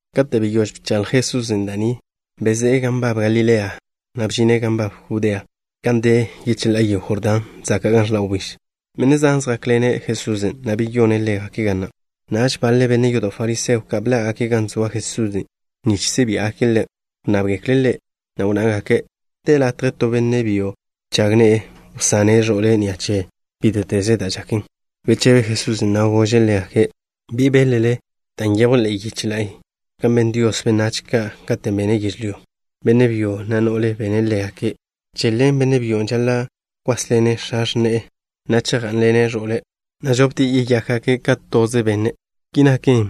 Kate' beyóž bchaḻj Jesusen' da' ni, bezé'e gan nbab Galilea, na' bžine' gan nbab Judea gan de yecheḻá'a yego Jordán zaka' gan ẕḻa' wbíž. Benne' zan zjákḻene' Jesusen', na' beyone' ḻégake' ga na'. Naž baḻe benne' yodo' fariseo ka' bḻá'gake' gan zoa Jesusen' nich si' biá'gake' Ḻe'. Wnnábgekle' Ḻe', na' wnnágake': —¿De latje to benne' byo nžag ne'e wsane' ẕo'le' ni'a che bíte'teze da' žaken? Bechebe Jesusen', na' gože' ḻégake': —¿Bi beḻ-le da' nyejw ḻe'e yiche la'y kan ben Dios benách ka' katen' bene' yežlyó? Benne' byo, na' no'le bene' ḻégake'. Ki wnná Dios: “Che ḻen, benne' byon' žaḻa' kwásḻene' x̱a x̱ne'e, na' chejgá'nḻene' ẕo'le', na' žoptie' yeyákgake' ka toze benne'.” Ki naken,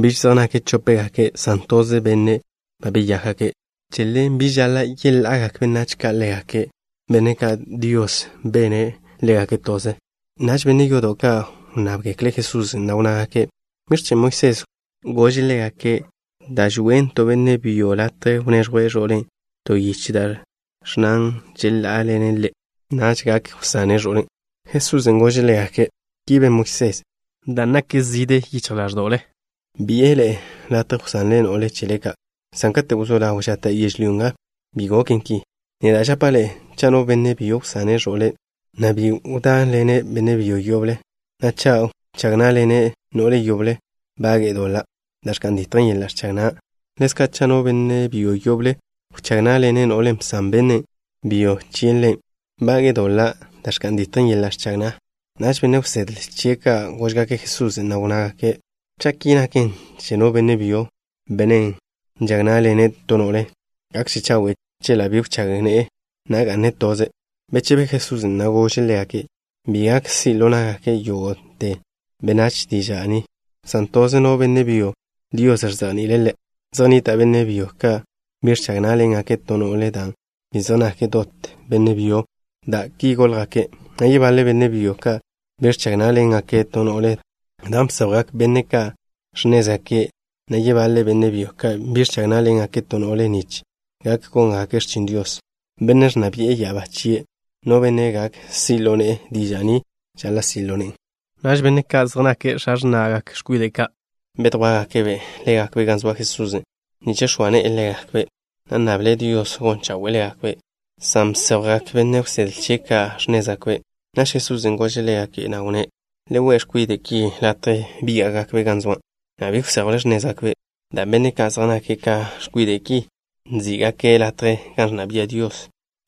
biž zej nake' chópgake' san toze benne' ba beyákgake'. Che ḻen, bi žaḻa' yeḻa'agak benách ka' ḻégake', benne' ka' Dios bene' ḻégake' toze. Naž benne' yodo' ka' wnnábgekle' Jesusen', na' wnnágake': —¿Biẕ chen' Moisés gože' ḻégake' da' žonnen to benne' byo latje wneẕjwe' ẕo'le' to yiche da' ẕnnan žeḻá'aḻene' ḻe', na' naž gak wsane' ẕo'len'? Jesusen' gože' ḻégake': —Ki ben Moisés dan' nak zižje yichj ḻáẕdo'le, bi'e ḻe'e latje wsanle no'le chele ka', san kate' wzó ḻaw žata' yežlyó nga, bi goken ki. Neda' žapa' ḻe'e, cha' no benne' byo wsane' ẕo'le', na' bi wdáḻene' benne' byo yoble, na' cha' wchág ná'ḻene' no'le yoble, bage'e doḻa' da' ẕka'n ditjen yeḻa' ẕchag na'. Ḻezka', cha' no benne' byo yoble wchág ná'ḻene' no'len' bsan benne' byo chie' ḻe', bage'e doḻa' da' ẕka'n ditjen yeḻa' ẕchag na'. Naž benne' wsedle chie' ka' góžgake' Jesusen', na' wnnágake': —Cha' ki naken che no benne' byo, benne' nžag ná'ḻene' to no'le, gakže chawe' chie' chela' bi wchág ne'e, na' ga'ne' toze'. Bechebe Jesusen', na' gože' ḻégake': —Bi gak si' ḻo na'gak yógo'te benách diža' ni, san toze no benne' byo Dios ẕzejni'ile' ḻe'. Zej nnita' benne' byo ka' bi ẕchag ná'ḻengake' to no'le dan' bi zej nake' dot benne' byo, dan' ki góljgake', na' yebaḻe benne' byo ka' bi ẕchag ná'ḻengake' to no'le dan' bséjwgak benne' ka' x̱nézgake', na' yebaḻe benne' byo ka' bi ẕchag ná'ḻengake' to no'le nich gak góngake' x̱chin Dios, Bennen' ẕnna bi'e ya'abá chie'. No benne' gak si' ḻo ne'e diža' ni žaḻa' si' ḻo ne'en. Naž benne' ka' zej nake' x̱a x̱na'gak x̱kwide' ka', bedjwá'gake' ḻégakbe' gan zoa Jesusen' nich x̱oa ne'e ḻégakbe', na' nnable' Dios gon chawe'e ḻégakbe', san bséjwgak benne' wsedle chie' ka' x̱nézgake'. Naž Jesusen' gože' ḻégake', na' wnné': —Le we' x̱kwide' ki latje bíga'gakbe' gan zoa', na' bi wséjwle x̱nézgakbe', dan' benne' ka' zej nake' ka x̱kwide' ki nzí'gake' latje gan ẕnna bia' Dios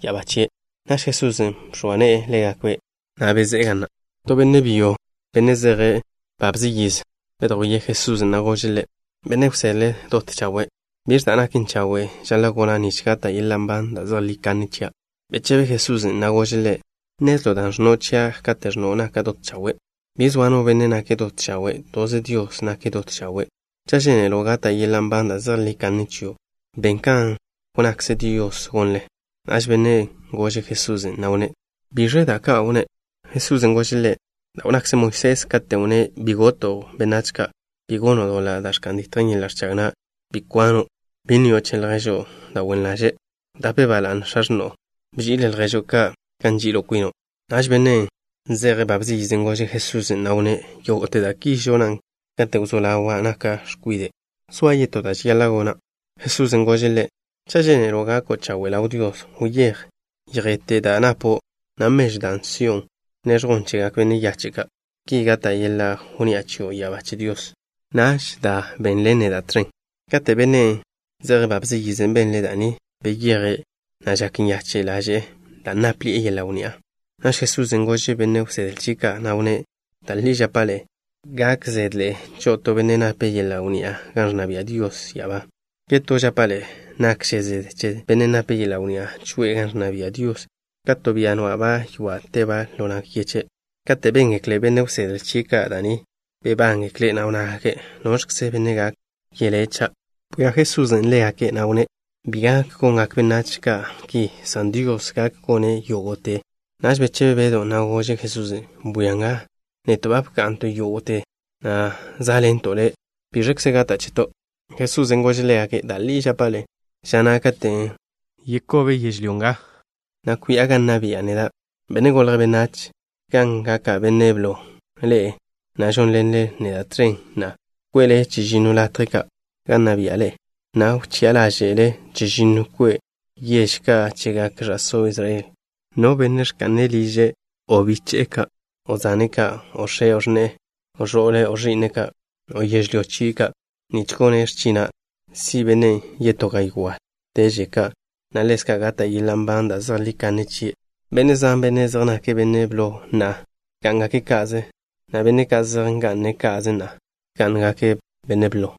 ya'abá chie'. Naž Jesusen' bx̱oa ne'e ḻégakbe', na' bezé'e ga na'. To benne' byo, benne' zeje' babze yiz, bedjwíe' Jesusen', na' gože' Ḻe': —Benne' wsedle dot chawe'. ¿Biẕ da' naken chawe' žaḻa' gona' nich gata' yeḻa' nban da' zejlí kanne chia'? Bechebe Jesusen', na' gože' ḻe': —¿Nnezlo' dan' ẕnno' chia' kate' ẕnno' naka' dot chawe'? Bi zoa no benne' nake' dot chawe'. Toze Dios nake' dot chawe'. Cha' žénelo' gata' yeḻa' nban da' zejlí kanne chio', ben kan wnnakze Dios gonle. Naž bennen' gože' Jesusen', na' wnné': —¿Biẕle da' ka' wnné'? Jesusen' gože' ḻe': —Da' wnnakze Moisés katen' wnné': Bi goto' benách ka'. Bi gono' doḻa' da' ẕka'n ditjen yeḻa' ẕchag na'. Bi kwano'. Bi nnio' che lježo' da' wen ḻaže'. Wdape ba la'ne x̱a x̱no'o. Bži'il lježo' ka' kan nži'il kwino'. Naž bennen' zeje' babze yiz gože' Jesusen', na' wnné': —Yógo'te da' ki žona' kate' wzó ḻaw naka' x̱kwide'. ¿Zoa yetó da' žaḻa' gona'? Jesusen' gože' ḻe': —Cha' žénelo' gako' chawe' ḻaw Dios, wyéj, yjete' da' napo', na' mežwn' da' si'o, bneẕjwn chegak benne' yache' ka'. Ki gata' yeḻa' wnni'a chio' ya'abá che Dios. Naž da, benḻen neda' tẕen. Kate' bennen' zeje' babze yiz benle' da' ni, beyeje', na' žak nyache' ḻaže'e dan' nápḻi'e yeḻa' wnni'a. Naž Jesusen' gože' benne' wsedle chie' ka', na' wnné': —Da' li žapa' ḻe'e, gak zede cho'o to benne' nape' yeḻa' wnni'a gan ẕnna bia' Dios ya'abá. Yetó žapa' ḻe'e, nakže zede che bennen' nape' yeḻa' wnni'a choe'e gan ẕnna bia' Dios ka te to bia nwa'ba' ywa' ḻo nag yeche'. Kate' béngekle benne' wsedle chie' ka' da' ni, bebángekle', na' wnnágake': —¿Noẕkze benne' gak yelé', cha'? Bwia Jesusen' ḻégake', na' wnné': —Bi gak gongak benách ka' ki, san Dios gak gone' yógo'te. Naž bechebe Bedw, na' gože' Jesusen': —Bwia nga, neto' ba bka'nto' yógo'te, na' zá'ḻento' Le'. ¿Biẕže gata' cheto'? Jesusen' gože' ḻégake': —Da' li žapa' ḻe'e, ža na' katen' wkób yežlyó nga, na' kwi'a gan nna bi'a neda', Benne' Golje' Benách, gan gaka' Benne' Blo, ḻe'e na' žónḻenle neda' tẕen na'a, kwe'le chežinno latje ka' gan nna bia'le, na' wchi'a ḻáže'le chežinno kwe'te yež ka' chegak ẕa'só Israel. No benne' ẕka'ne' liže', o biche'e ka', o zane' ka', o x̱e', o x̱ne'e, o ẕo'le', o ẕi'ne' ka', o yežlyó chie' ka', nich gone' x̱china', si' bennen' yetó gaywá'teže ka', na' ḻezka' gata' yeḻa' nban da' zejlí kanne chie'. Benne' zan, benne' zej nake' benne' blo na'a, gá'ngake' ka'ze, na' benne' ka' zej nga'ne' ka'ze na'a, gákgake' benne' blo.